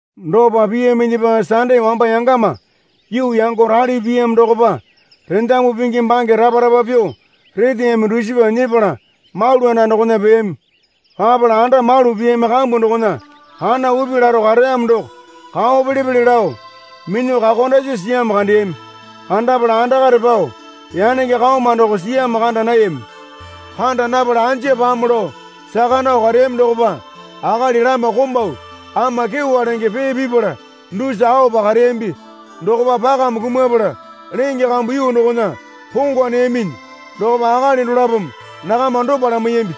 Dopa piyaminyipa Sande wamba yangama yuu yango rali piyamo dokopa rendamu pingi bange rapa rapa pyuo reteyaminyi dusipa nyepala malu anda dokona peyami. Papala anda malu piyami kambu dokona kana upi laro kareyamo doko kao pele pele lao minyuo kakondasi siyamo kandeyami. Kandapala andakare pao yanenge kaoma doko siyamo kanda nayami. Kanda napala anja pamo lao saka nao kareyami dokopa akali lama komau ama kyewa lenge pee pipala dusa aopa kareyambi. Dokopa pakame kumapala lenge kambu yuu dokona pongwa neyaminyi dokopa akali dolapome nakama dopa lamaiyambi.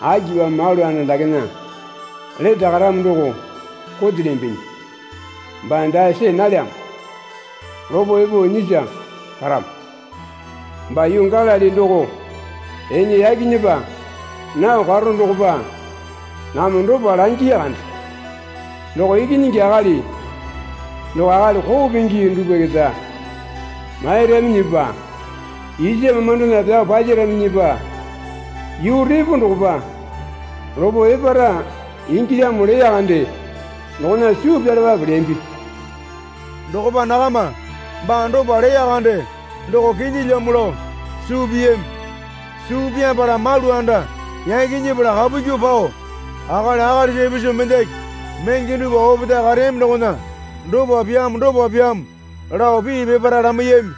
Akipamo malu anda dakena lete karamo doko kotelyambinyi? Baa dae see nalyamo. Lopo epo nyisa karamo. Baa yuu Galili doko ene yaki nyepa nao karo dokopa nakama dopa langiya kande. Doko Ikinyingi Akali doko akali koo pingi dupwa keta mairaminyipa isa mamandona pyao palyaraminyipa yuu repo dokopa lopo epara ingilyamo leya kande dokona suu pyalapape leyambi. Dokopa nakama baa dopa leya kande doko kinyilyamo lao suu piyami. Suu pyapala malu anda yaki nyepala kapu kyuo pao akali akalisa ipisu mendaki menge dupwa opetae kareyami dokona dopa pyamo dopa pyamo lao pii peparae lamaiyami.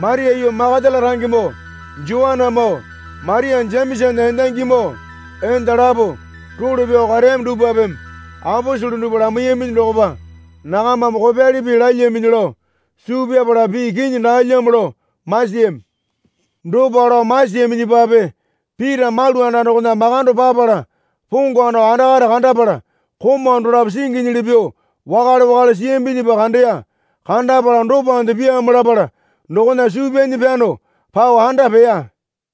Maria yuu Makatala rangemoo, Joanamoo, Maria Jemesana endangimoo, enda lapo role pyao kareyami dupwapeme aposele dupwa lamaiyami. Lamaiyaminyi dokopa nakamame kopyali pii lalyaminyi lao suu pyapala pii kinyi daalyamo lao masiyami. Dopa lao masiyaminyipape Pita malu anda dokona makando papala pongwa nao andakare kandapala komau dolapo singinyili pyuo wakale wakale siyambinyipa kandeya. Kandapala dopande pyamo lapala dokona suu pyanyi pyano pao anda peya.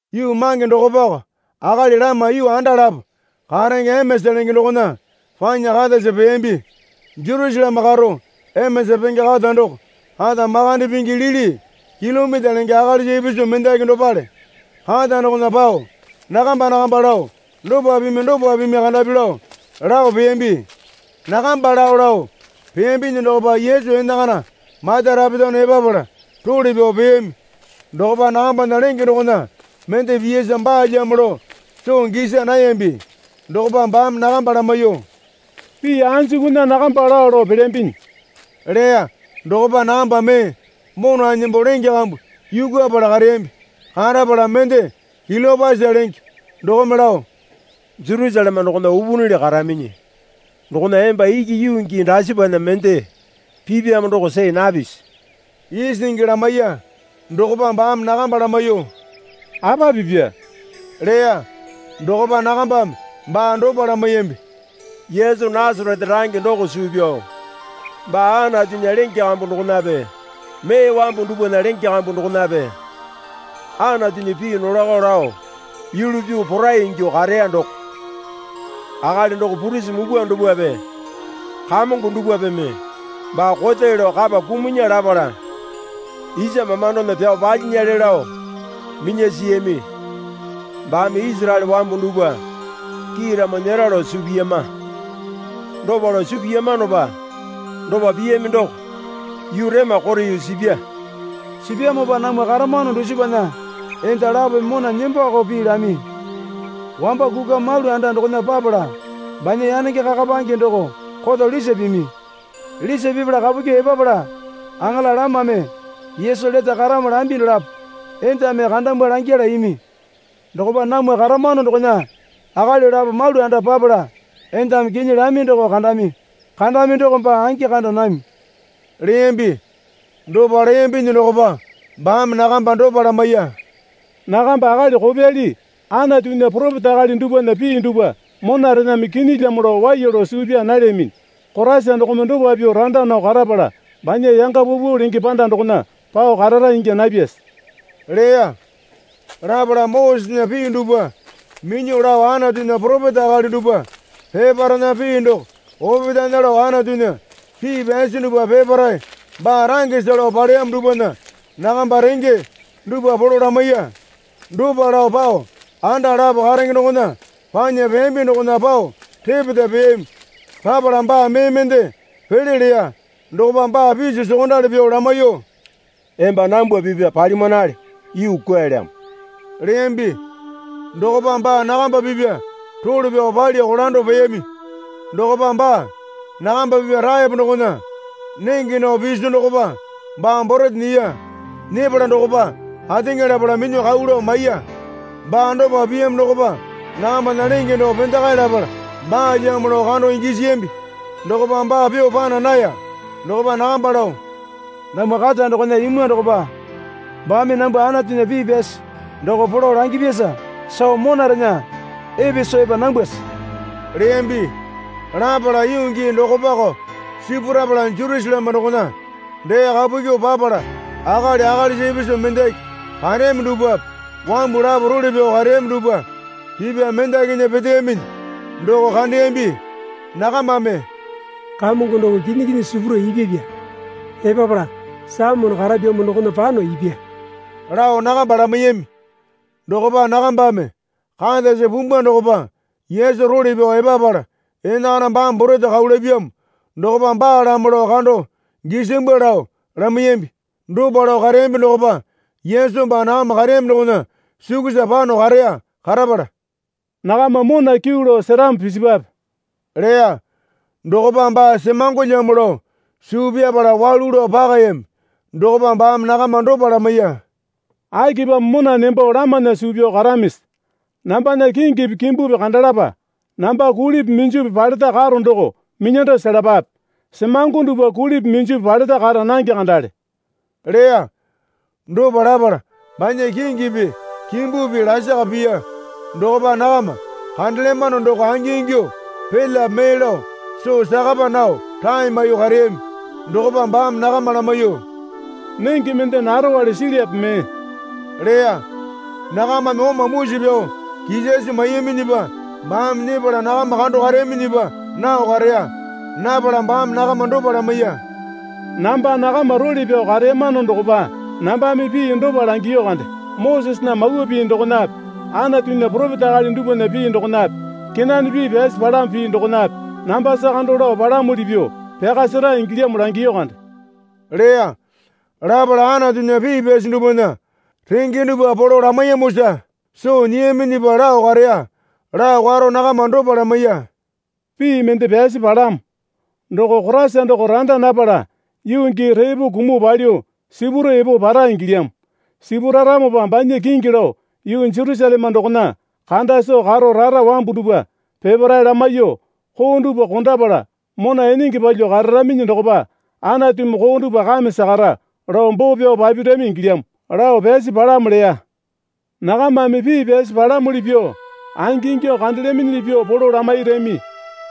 Yuu mange dokopako akali lama yuu anda lapo karenge Emeasa lenge dokona panya katasa peyambi. Jerusaleme karo Emeasa penge kata doko kata makande pingi lili kilomita lenge akalisa ipisu mendaki dopale. Kata dokona pao nakamba nakamba lao dopa pimi dopa pimi kandapi lao lao peyambi. Nakamba lao lao peyambinyi dokopa Yesu enakana mata rapetano epapala role pyao peyami. Dokopa nakambana lenge dokona mende piyasa baalyamo lao soo gisa nayambi. Dokopa baame nakamba lamaiyuo, Pii anjukunya nakamba lao lao pelyambinyi? leya. Dokopa nakamba mee mona nembo lenge kambu yukupala kareyambi. Karapala mende Kiliopasa lenge dokome lao, Jerusaleme dokona upunili karaminyi dokona emba iki yuu gii dasipana mende pipyamo doko see napisi? isingi lamaiya. Dokopa baame nakamba lamaiyuo, Apa pipya? leya. Dokopa nakambame baa dopa lamaiyambi. Yesu Nasarete range doko suu pyao, baa Anatunya lenge kambu dokonape mee wambu dupwana lenge kambu dokonape Anatunya pii nolako lao yulu pyuo porai ingyuo kareya doko. Akali doko purisi mupwa dupwape kamongo dupwapeme baa kote lao kapa kumunya lapala, isa mamandona pyao palyinyale lao minya siyami. Baame Isaraele wambu dupwa kiiramo nyera lao suu piyama. Dopa lao suu piyamanopa dopa piyami doko yuu rema kote yuu sipya. Sipyamopa namwa karamano dusipana enda lapome mona nembakao pii lami. Wamba kukwa malu anda dokona papala banya yanenge kakapange doko koto lisa pimi. Lisa pipala kapu kyuo epapala aŋala lamame Yesu lete karamo lambi dolapo endame kandamwa langyala imi. Dokopa namwa karamano dokona akali lapo malu anda papala endame kinyi lami doko kandami. Kandami doko baa angi kanda nami, leyambi. Dopa leyambinyi dokopa baame nakamba dopa lamaiya. Nakamba akali kopyali Anatunya poropeta akali dupwana pii dupwa monarename kinyilyamo lao waiya lao suu pyaa nalyaminyi. Koraisa dokome dopa pyuo randa nao karapala banya yanga paupau lenge panda dokona pao karara ingya napyase? leya. Lapala Mosesena pii dupwa minyuo lao Anatunya poropeta akali dupwa peparaena pii doko opetaena lao Anatunya pii pyasi dupwa peparae baa rangesa lao paleyamo dupwana nakamba renge dupwa polo lamaiya. Dopa lao pao anda lapo karenge dokona panya peyambi dokona pao repeta peyami. Papala baa mee mende pele leya. Dokopa baa piso sokondali pyuo lamaiyuo, Emba nambwa pipya palimanale, yuu kwualyamo leyambi. Dokopa baa nakamba pipya role pyao palya kolando peyami. Dokopa baa nakamba pipya taepo dokona nenge nao piso dokopa baa borete nyiya. Nyepala dokopa ateŋa lapala minyuo kau lao maiya. Baa dopa piyamo dokopa nakambana lenge doko pendakae lapala baalyamo lao kando gisiyambi. Dokopa baa pyuo pana naya. Dokopa nakamba lao, Namwa kata dokona imwa dokopa baame nambwa Anatunya pii pyasi doko polo langyapyasa soo monarena epe soo epa nambwase? leyambi. Lapala yuu gii dokopako sipurapala Jerusaleme dokona dee kapu kyuo papala akali akalisa ipisu mendaki kareyami dupwape wambu lapo role pyao kareyami dupwa pipya mendakinya peteyaminyi doko kandeyambi. Nakamame, Kamongo doko kinyi kinyi sipuro ipyapya. Epapala Saimone karapyamo dokona pano ipya, lao nakamba lamaiyami. Dokopa nakambame, Katasa pumbwa dokopa Yesu role pyao epapala enakana baame borete kau lapyamo dokopa baalamo lao kando gisambwa, lao lamaiyambi. Dopa lao kareyambi dokopa Yesu baa nakama kareyami dokona sukusa pano kareya. Karapala, Nakama mona kyuu lao seramo pisipwape leya. Dokopa baa semangolyamo lao suu pyapala walu lao pakayami. Dokopa baame nakama dopa lamaiya. Akipamo mona nembo lamana suu pyao karamisi? Nambana kingipi kimbupi kandalapa. Namba kulipi minjupi paleta karo doko minyando selapape. Semango dupwa kulipi minjupi paleta kara nange kandale leya. Dopa lapala banya kingipi kimbupi lasaka piya. Dokopa nakama kandelyamano doko angingyuo pelyape mee lao soo sakapa nao rae maiyuo kareyami. Dokopa baame nakama lamaiyuo, Nenge mende narowale silyape mee? leya. Nakamame oma musi pyao kisasi maiyaminyipa baame nyepala nakama kando kareyaminyipa nao kareya. Napala baame nakama dopa lamaiya. Namba nakama role pyao kareyamano dokopa nambame pii dopa langiyu kande, Mosesena Mawa Pii dokonape Anatunya poropeta akali dupwana pii dokonape kenane pii pyasi palamo pii dokonape nambasa kando lao palamuli pyuo pyaka sera ingilyamo langiyu kande, leya. Lapala Anatunya pii pyasi dupwana renge dupwa polo lamaiyamosa soo nyiyaminyipa lao kareya. Lao karo nakama dopa lamaiya. Pii mende pyasi palamo. Doko Koraisa doko randa napala yuu gii repo kumuo palyuo sipuro epo para ingilyamo. Sipuraramopa banya kingi lao yuu Jerusaleme dokona kanda soo karo rara wambu dupwa peparae lamaiyuo, koo dupwa kondapala mona enenge palyuo kararaminyi dokopa Anatumi koo dupwa kame sakara, lao boo pyao papirami ingilyamo, lao pyasi palamo leya. Nakamame pii pyasi palamuli pyuo angi ingyuo kandelyaminyili pyuo polo lamairami.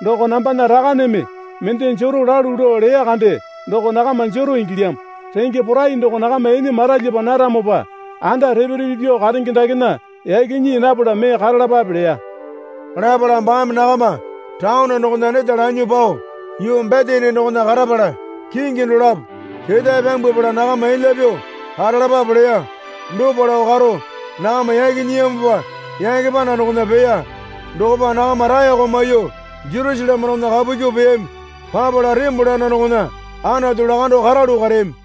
Doko nambana Rakaneme mende jero lalu lao leya kande doko nakama jero ingilyamo. Renge porai doko nakama ene maralyapa naramopa anda repe repe pyuo karenge dakena yaki nyii napala mee karalapape leya. Lapala baame nakama taone dokona neta lanyuo pao yuu Betani dokona karapala kingi dolapo ketae pyambwapala nakama elya pyuo karalapape leya. Dopa lao karo nakama yaki nyiyamopa yake panda dokona peya. Dokopa nakama raeko maiyuo Jerusaleme dokona kapu kyuo peyami. Papala tembole anda dokona Anatu lakando karalu kareyami.